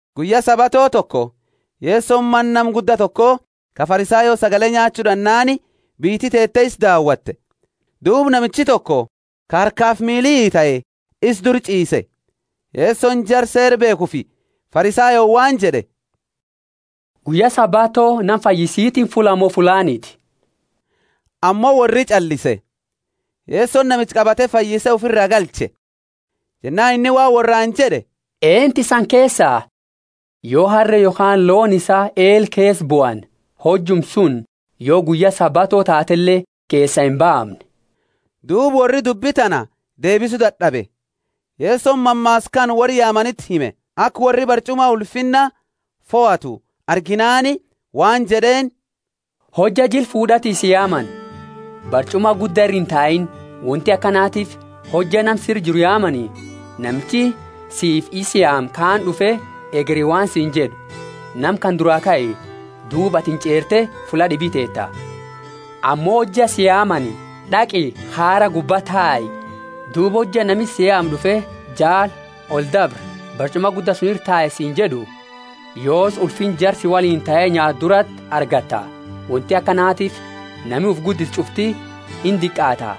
Guyya Sabato toko Yesoni mana nama gudda toko ka Farisayo sagale nyaachu d'annaani, biyyiti teete isa daawate. Duuba namichi toko ka harkafi miili itae isa dura ch'iise. Yesoni jara Seera beekhufi Farisayooni waan jed'e, Guyya Sabato nama fayyisitiini fullaa mo fullaaniti? Ammo worri inch'allise. Yesoni namicha qabate fayyise ufira galche. Jennaani inni waan worraani jed'e, Eentu isani keesa, yo harre yokhaani looni isaa eela keesa buani hojuma suni yo guyya Sabato taatele keesaa imbaamne? Duuba worri dubbi tana deebisu dad'abe. Yesoni mammaasa kana worra yaamaniti hime, aka worri barch'uma ulfinna fohatu arginaani waan jed'eeni, Hojja jila fuud'ati si yaamani, barch'uma gudda ira intaini; wonti akanatiifi hojja nama sira jiru yaamani, namichi siifi isa yaame kaani d'ufe hegeri waan siini jed'u, Nama kana duraa kai, duuba atini ch'eerte fulla d'ibi teeta. Ammo hojja si yaamani d'aqi khaara gubba tae, duuba hojja nami si yaame d'ufe jaali, oldabri, barch'uma gudda suni ira tai siini jed'u, yoosi ulfinna jara si woliini tae nyaatu durati argatta. Wonti akanatiifi nami ufi guddisu ch'ufti indiqaata,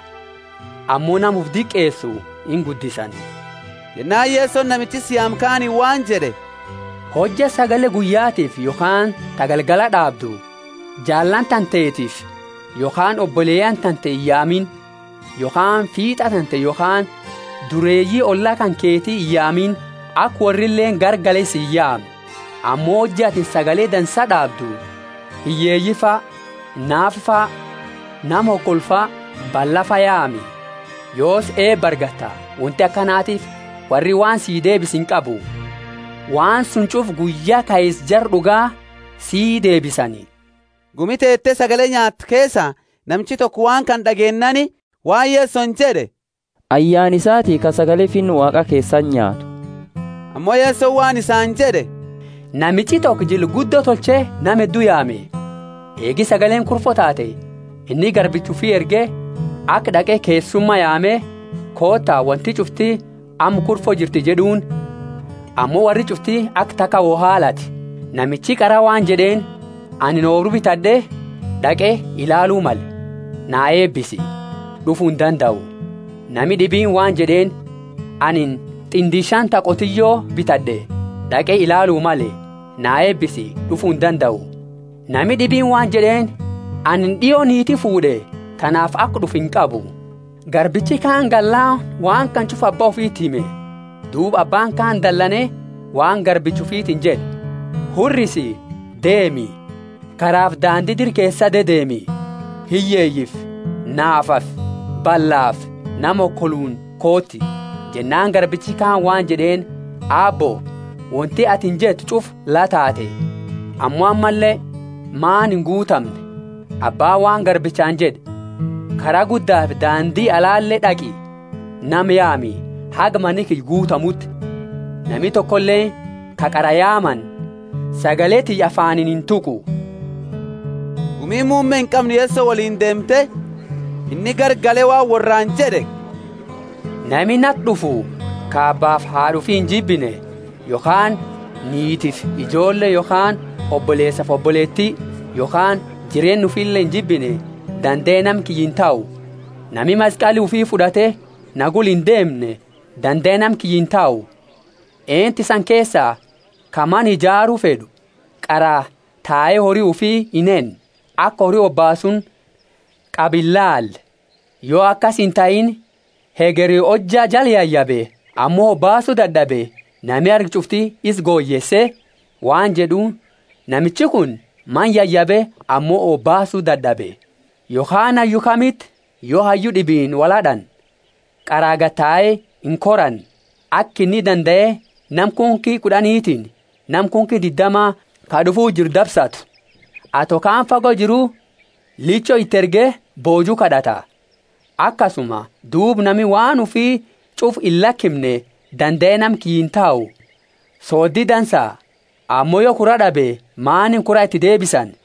ammo nama ufi diqeesu inguddisani. Jennaani Yesoni namicha isa yaame kaaniini waan jed'e, Hojja sagale guyyatiifi yokhaani ta galgala d'aabdu, jaallani tantetiifi, yokhaani oboleyaani tante iyaamini, yokhaani fiit'a tante yokhaani dureeyi olla kanketi iyaamini, aka worrileeni garagale si iyaamne. Ammo hojja atini sagale dansa d'aabdu, hiyyeeyifa, naafafa, nama hokolufa, ballafa yaami, yoosi eeba argatta; wonti akanatiifi worri waan si deebisu inqabu. Waan suni ch'ufa guyya kaisa jara d'uga si deebisani. Gumi teete sagale nyaattu keesa namichi toko waan kana d'ageennaani waan Yesoni jed'e, Ayyaana isati ka sagale Finna Waaqa keesati nyaatu. Ammo Yesoni waan isaani jed'e, Namichi toko jila guddo tolche nama heddu yaame. Eegi sagaleeni kurfo taate, inni garbicha ufi erge aka d'aqe keessuma yaame, Koota, wonti ch'ufti amma kurfo jirti jed'uuni. Ammo worri ch'ufti aka taka wo haalate. Namichi qara waan jed'eeni, Anini oobru bitad'e, d'aqe ilaalu male; na eebisi, d'ufu indandau. Nami d'ibiini waan jed'eeni, Anini t'indi shani ta qotiyo bitad'e, d'aqe ilaalu male; na eebisi, d'ufu indandau. Nami d'ibiini waan jed'eeni, Anini d'io niiti fuud'e, tanaafi aka d'ufu inqabu. Garbichi kaani gallaani waan kana ch'ufa abba ufiti hime. Duuba abbaani kaani dalane waan garbicha ufitiini jed'e, hurrisi, deemi, karaafi daandi dira keesa dedeemi, hiyyeeyifi naafafi ballafi nama hokoluuni kooti. Jennaani garbichi kaani waan jed'eeni, Aabbo, wonti atini jette ch'ufa la taate, ammo ammalle mani inguutamne. Abbaani waan garbichaani jed'e, Kara guddafi daandi alale d'aqi, nama yaami, haga mani kiyya guutamuuti. Nami tokoleeni ka qara yaamani sagale tiyya afaaniini intuqu. Gumiini muumme inqamne Yeso woliini deemte, inni garagale waan worraani jed'e, Nami nati d'ufu, ka abbaafi haad'a ufi injibine, yokhaani niitifi ijoolle yokhaani oboleesafi oboleeti yokhaani jireenna ufile injibine, dandae nama kiyya intahu. Nami maskali ufi fud'ate na gula ind'umne dandae nama kiyya intahu. Eentu isani keesa ka mana ijaaru fed'u, qara tae hori ufi inhenne, aka hori hobaasuuni qabu inilaale? Yo akasi intahiini, hegeri hojja jala yayabe ammo hobaasu dad'abe, nami argu ch'ufti isa goyeese, waan jed'u, Namichi kuni mana yayabe ammo hobaasu dad'abe. Yokhaani hayyu kamiti, yo hayyu d'ibiini wolhad'ani, qara gadi tae inkorane, aka inni dandae nama kunki kud'anitiini nama kunki diddama ka d'ufuu jiru dabsatu? Yo indandeenne, ato kaani fago jiru, licho iti erge booju kad'ata. Akasuma duuba nami waan ufi ch'ufa illakimne dandae nama kiyya intahu. Sooddi dansa, ammo yo kura d'abe maaniini kura iti deebisani?